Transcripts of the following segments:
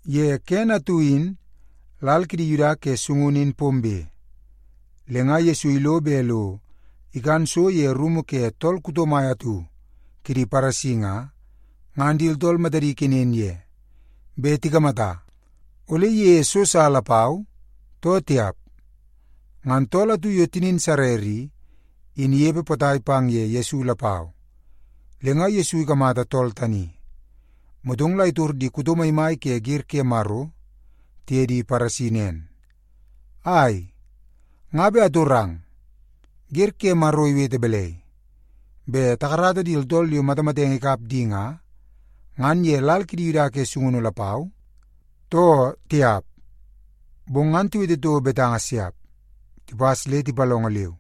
Ye kene atu in lal kidi Yuda ke sungunu in pombe, le nga Yesu ilo bet lo ikan so ye rumu ke tool kuto mai atu kidi Paresi nga, ngan di tooltool matadi ikenen ye bet tikamata ole iyeie so sa lapau, too tiap. Ngan tool atu yo tinin sarer i, in inepe potai pang ye Yesu lapau. Le nga Yesu ikamata tool tani, motong la itor di kuto maimai ke wer ke Maro tiye di Paresi nen, “Ai, nga bet atorang. Wer ke Maro iwete balai, bet takarata di tooltool yo matamatenge ikap di nga, ngan ye lal kidi Yuda ke sungunu lapau, too tiap?” Bong ngan tiwete toko betanga siap. Tipas le tipalongo leu.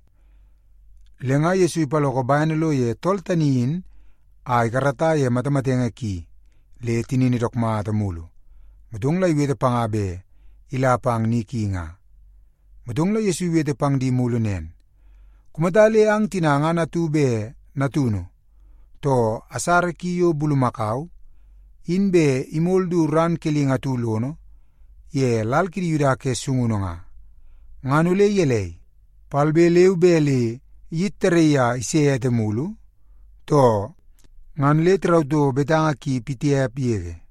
Le nga Yesu ipaloko bene lo ye tool tani in a ikarata ye matamatenge ki le tinini dook mata mulu, motong la iwete panga bet ila pang ni ki nga. Motong la Yesu iwete pang di mulu nen, “Kumata le ang tina ngan atu bet natunu, too asara ki yo bulumakau, in bet imol du ran kelingi atu lono ye lal kidi Yuda ke sungunu nga, ngan ole gelei, palbe leu be la kayit tarraii a ise ete mulu, too?” Ngan le tirau toko betanga ki pitiap yege.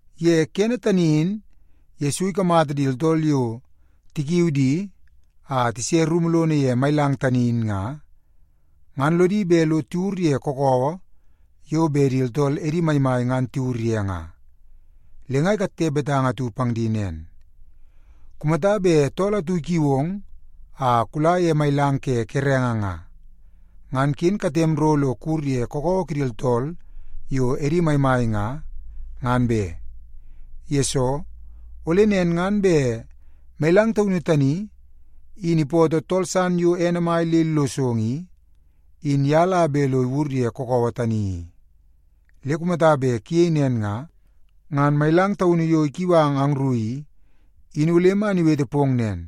Ye kene tani in Yesu ikamata di tooltool yo tikiu di a tise rumu lono ye mailang tani in nga, ngan lodi bet lo tiwur ye kakawa yo bet di tooltool edi maimai ngan tiwur ye nga. Le nga ikatte betanga atu pang di nen, “Kumata bet tool atu ikiu ong a kula ye mailang ke kerenge nga, ngan ken katem ro lo kuwur ye kakawa kidi tooltool yo edi maimai nga, ngan be. Yesoo, ole nen ngan bet mailang taunu tani in ipootoo tool san yo ene mai le illosong i, in ye la bet lo iwur ye kakawa tani i. Le kumata bet kuyei nen nga, ngan mailang taunu yo ikiu ang angru i, in ole man iwete pong nen,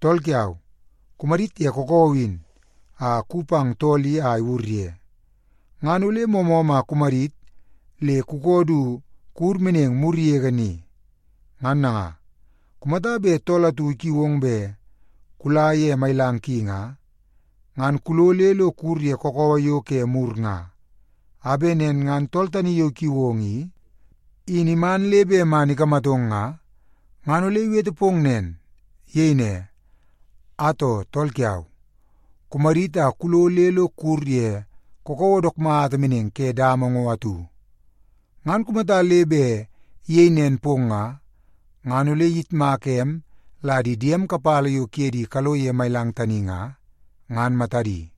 ‘Tool kiau, kumadit ye kakawa in a kuwi pang tool i a iwur ye.’ Ngan ole moomoom a kumadit le kukoo du kuwur meneng mur yege ni. Ngan nanga, kumata bet tool atu ikiu ong bet kula ye mailang ki nga, ngan kulo le lo kuwur ye kakawa yo ke mur nga, a bet nen ngan tool tani yo ikiu ong i, in iman le bet man ikamatong nga, ngan ole iwete pong nen. Iyei ne, ‘Atoo, tool kiau, kumadit a kulo le lo kuwur ye kakawa dook mata meneng ke dama ngo atu.’ Ngan kumata le bet iyei nen pong nga, ngan ole iyitmaka em la di diem kapala yo kuye di kalo ye mailang tani nga, ngan matadi.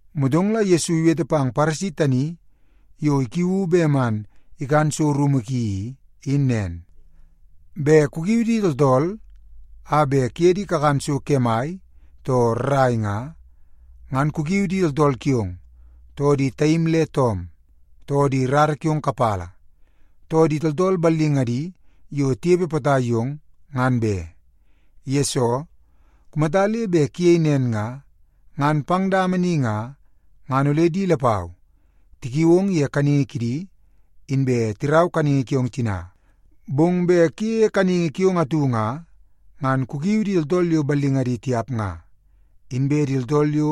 Motong la Yesu iwete pang Paresi tani yo ikiuu bet man ikan so rumu ki i, in nen, “Bet kukiu di tooltool a bet kuye di kakan so kemai, too rrai nga, ngan ken kukiu di tooltool kiong, too di taim le toom, too di rara kiong kapala, too di tooltool ballingadi yo tinepe potai yong, ngan be. Yesoo, kumata le bet kuyei nen nga, ngan pang dama ni nga, ngan ole di lapau tikiui ong ye kanningi kidi, inbe tirau kanningi kiong tina. Bong bet kuyeie kanningi kiong atu nga, ngan kukiu di tooltool yo ballingadi tiap nga, inbe di tooltool yo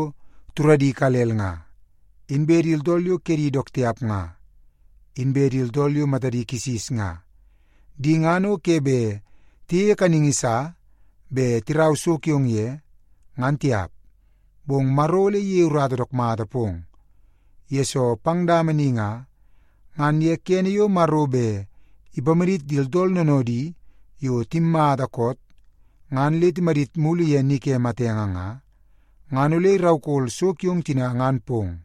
turadi ikalel nga, inbe di tooltool yo kedi dook tiap nga, inbe di tooltool yo matadi kisis nga. Di ngan o ke bet tiyeie kanningi sa bet tirau so kiong ye, ngan tiap. Bong Maro ole iyei urata dook mata pong, yesoo pang dama ni nga, ngan ye kene yo Maro bet ipamadit di tooltool noonoodi yo timmata koot ngan le timadit mulu ye ni ke matenge nga, ngan ole iraukol so kiong tina ngan pong.”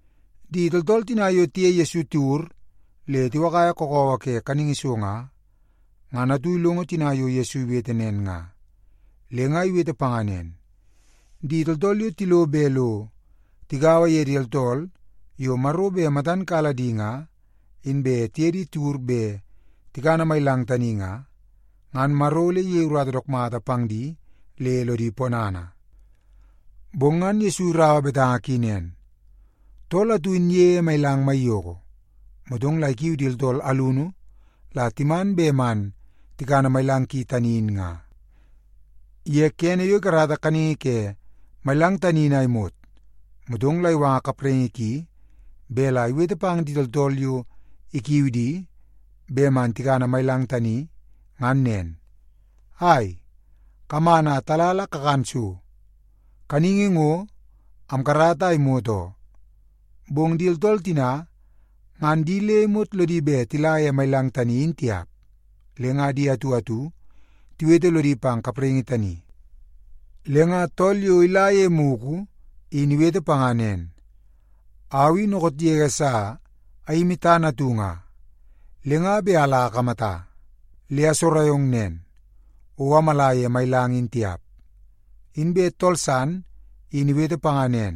Di tooltool tina yo tiye Yesu tiwur le tiwakaia kakawa ke kaningi so nga, ngan atu ilongo tina yo Yesu iwete nen nga, le nga iwete panga nen, “Di tooltool yo tilo bet lo tigaua ye di tooltool yo Maro bet matan kala di inbe tiye di tiwur bet tikana mailang tani nga, ngan Maro ole iyei urata dook mata pang di le lodi ponana.” Bong ngan Yesu iraua betanga ki nen, “Tool atu in iyeie mailang maiyoko, motong la ikiu di tooltool alunu la timan bet man tikana mailang ki tani in nga. Ye kene yo ikarata kaningi ke mailang tani in a imot, motong la iwanga kapraingi ki bet la iwete pang di tooltool yo ikiu di bet man tikana mailang tani ngan nen, ‘Ai, kaman a tala la kakan so. Kaningi ngo, amkarata a imot oo.’ “Bong di tooltool tina ngan di le imot lodi bet tila ye mailang tani in tiap, le nga di atu atu tiwete lodi pang kapraingi tani. Le nga tool yo ila ye mugu in iwete panga nen, ‘Au i dookoot yege sa ayimi tana atu nga, le nga bet ala akamata. Le asogorai ong nen, o amala ye mailang in tiap.’ “Inbe tool san in iwete panga nen,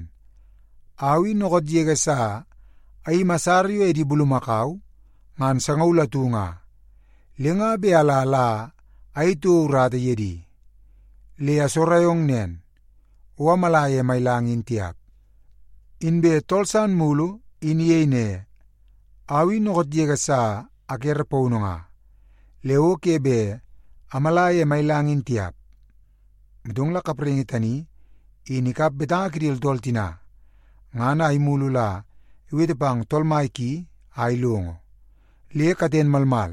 ‘Au i dookoot yege sa ayimi asara yo ene bulumakau ngan sangaul atu nga, le nga bet ala la ayei toko urata ye di. Le asogorai ong nen, o amala ye mailang in tiap.’ “Inbe tool san mulu in iyei ne, ‘Au i dookoot yege sa akere paunu nga, le o ke bet amala ye mailang in tiap.’ “Motong la kapraingi tani in ikap betanga kidi tooltool tina, ngan a imulu la iwete pang tool mai ki a ilongo, le katen malmal,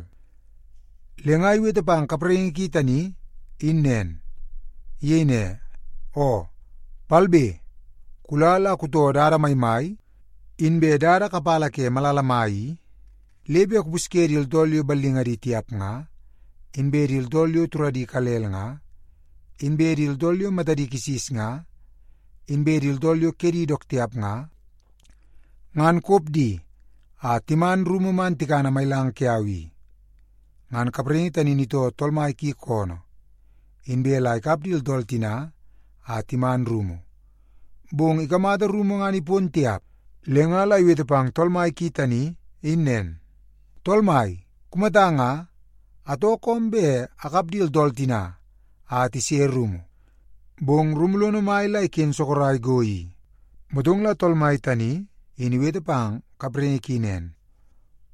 le nga iwete pang kapraingi ki tani in nen. Iyei ne, ‘Oo, palbe kula la kutoo dada maimai inbe dada kapala ke malala mai i, le bet kupusye di tooltool yo ballingadi tiap nga, inbe di tooltool yo turadi ikalel nga, inbe di tooltool yo matadi kisis nga, inbe di tooltool yo kedi dook tiap nga, ngan kop di a timan rumu man tikana mailang kiau i.’ “Ngan kapraingi tani in itoo tool mai ki koonoo, inbe la ikap di tooltool tina a timan rumu. Bong ikamata rumu ngan ipon tiap, le nga la iwete pang tool mai ki tani in nen, ‘Tool mai, kumata nga, atoo koom bet akap di tooltool tina a tise rumu, bong rumu lono mai la iken sorok go i.’ “Motong la tool mai tani in iwete pang kapraingi ki nen,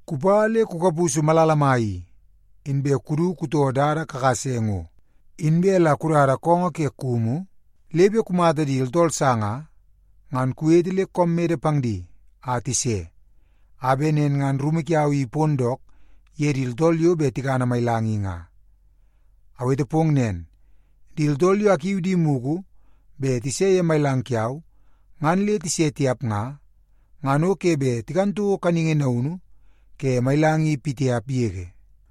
‘Kupa le kukapusu malala mai i, inbe kudu kutoo dada kakase ngo, inbe la kudada koongoo ke kumu le bet kumata di tooltool sa nga, ngan kuwete le koom mede pang di a tise, a bet nen ngan rumu kiau i ipon dook ye di tooltool yo bet tikana mailang i nga. Awete pong nen, di tooltool yo akiu di mugu bet tise ye mailang kiau ngan le tise tiap nga, ngan o ke bet tikan toko kaningi naunu ke mailang i pitiap yege.’”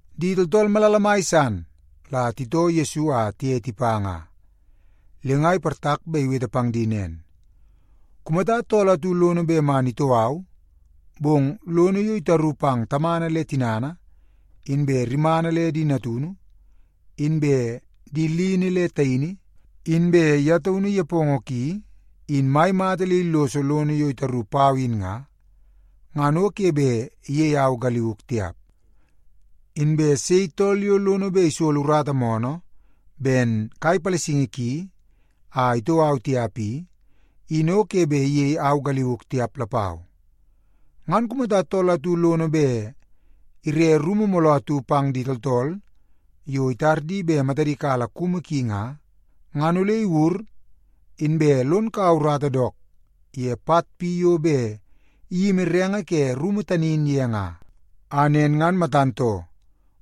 Di tooltool malala mai san la titoo Yesu a tiye tipa nga. Le nga iportak bet iwete pang di nen, “Kumata tool atu lono bet man itoo au, bong lono yo itaru pang tamana le tinana, inbe rimana le di natunu, inbe di lini le taini, inbe ye taunu nepongo ki in mai mata le illoso lono yo itaru pau in nga, ngan o ke bet iyei au galiuk tiap. Inbe sei tool yo lono bet isolo urata moonoo ben kai palasingi ki, a itoo au tiap i, in o ke bet iyei au galiuk tiap lapau. “Ngan kumata tool atu lono bet ire rumu mooloo atu pang di tooltool yo itar di bet matadi kala kumu ki nga, ngan ole iwur inbe lon kaua urata dook ye pat pi yo bet iyimi renge ke rumu tani in ye nga. A nen ngan matan too,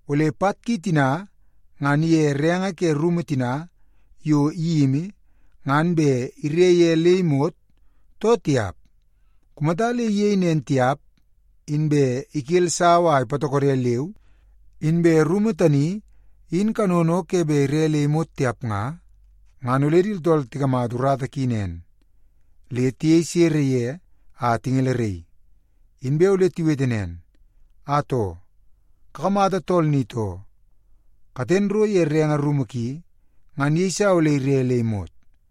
ole pat ki tina ngan ige renge ke rumu tina yo iyimi ngan bet ire ye le imot, too tiap. Kumata le iyei nen tiap, inbe ikel sawa a ipatokodo leu, inbe rumu tani in kanono o ke bet ire le imot tiap nga, ngan ole di tooltool tikamata urata ki nen, le tiyei sere ye a tingeleraii. Inbe ole tiwete nen, ‘Atoo, kakamata tool ni too, katen ro ye renge rumu ki ngan iyeisa ole ire le imot.’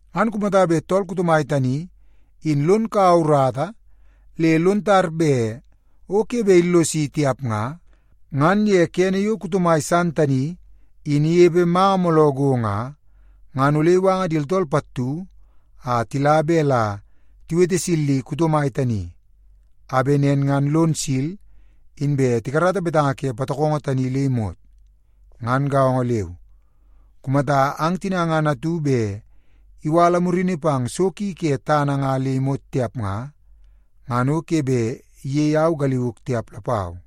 Ngan kumata bet tool kuto mai tani in lon kaua urata le lon tar bet o ke bet illosi tiap nga, ngan ye kene yo kuto mai san tani in inepe manga mooloo go nga, ngan ole iwanga di tooltool pattu a tila bet la tiwete silli kuto mai tani, a bet nen ngan lon sil inbe tikarata betanga ke patokongo tani le imot. Ngan gaongo leu, kumata ang tina ngan atu bet iwala murini pang so ki ke tana nga le imot tiap nga, ngan o ke bet iyei au galiuk tiap lapau.”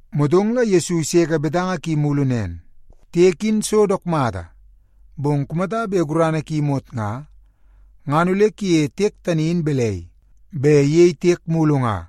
Motong la Yesu iseke betanga ki mulu nen, “Tiek in so dook mata, bong kumata bet gurana ki imot nga, ngan ole kuyeie tiek tani in balai bet iyei tiek mulu nga?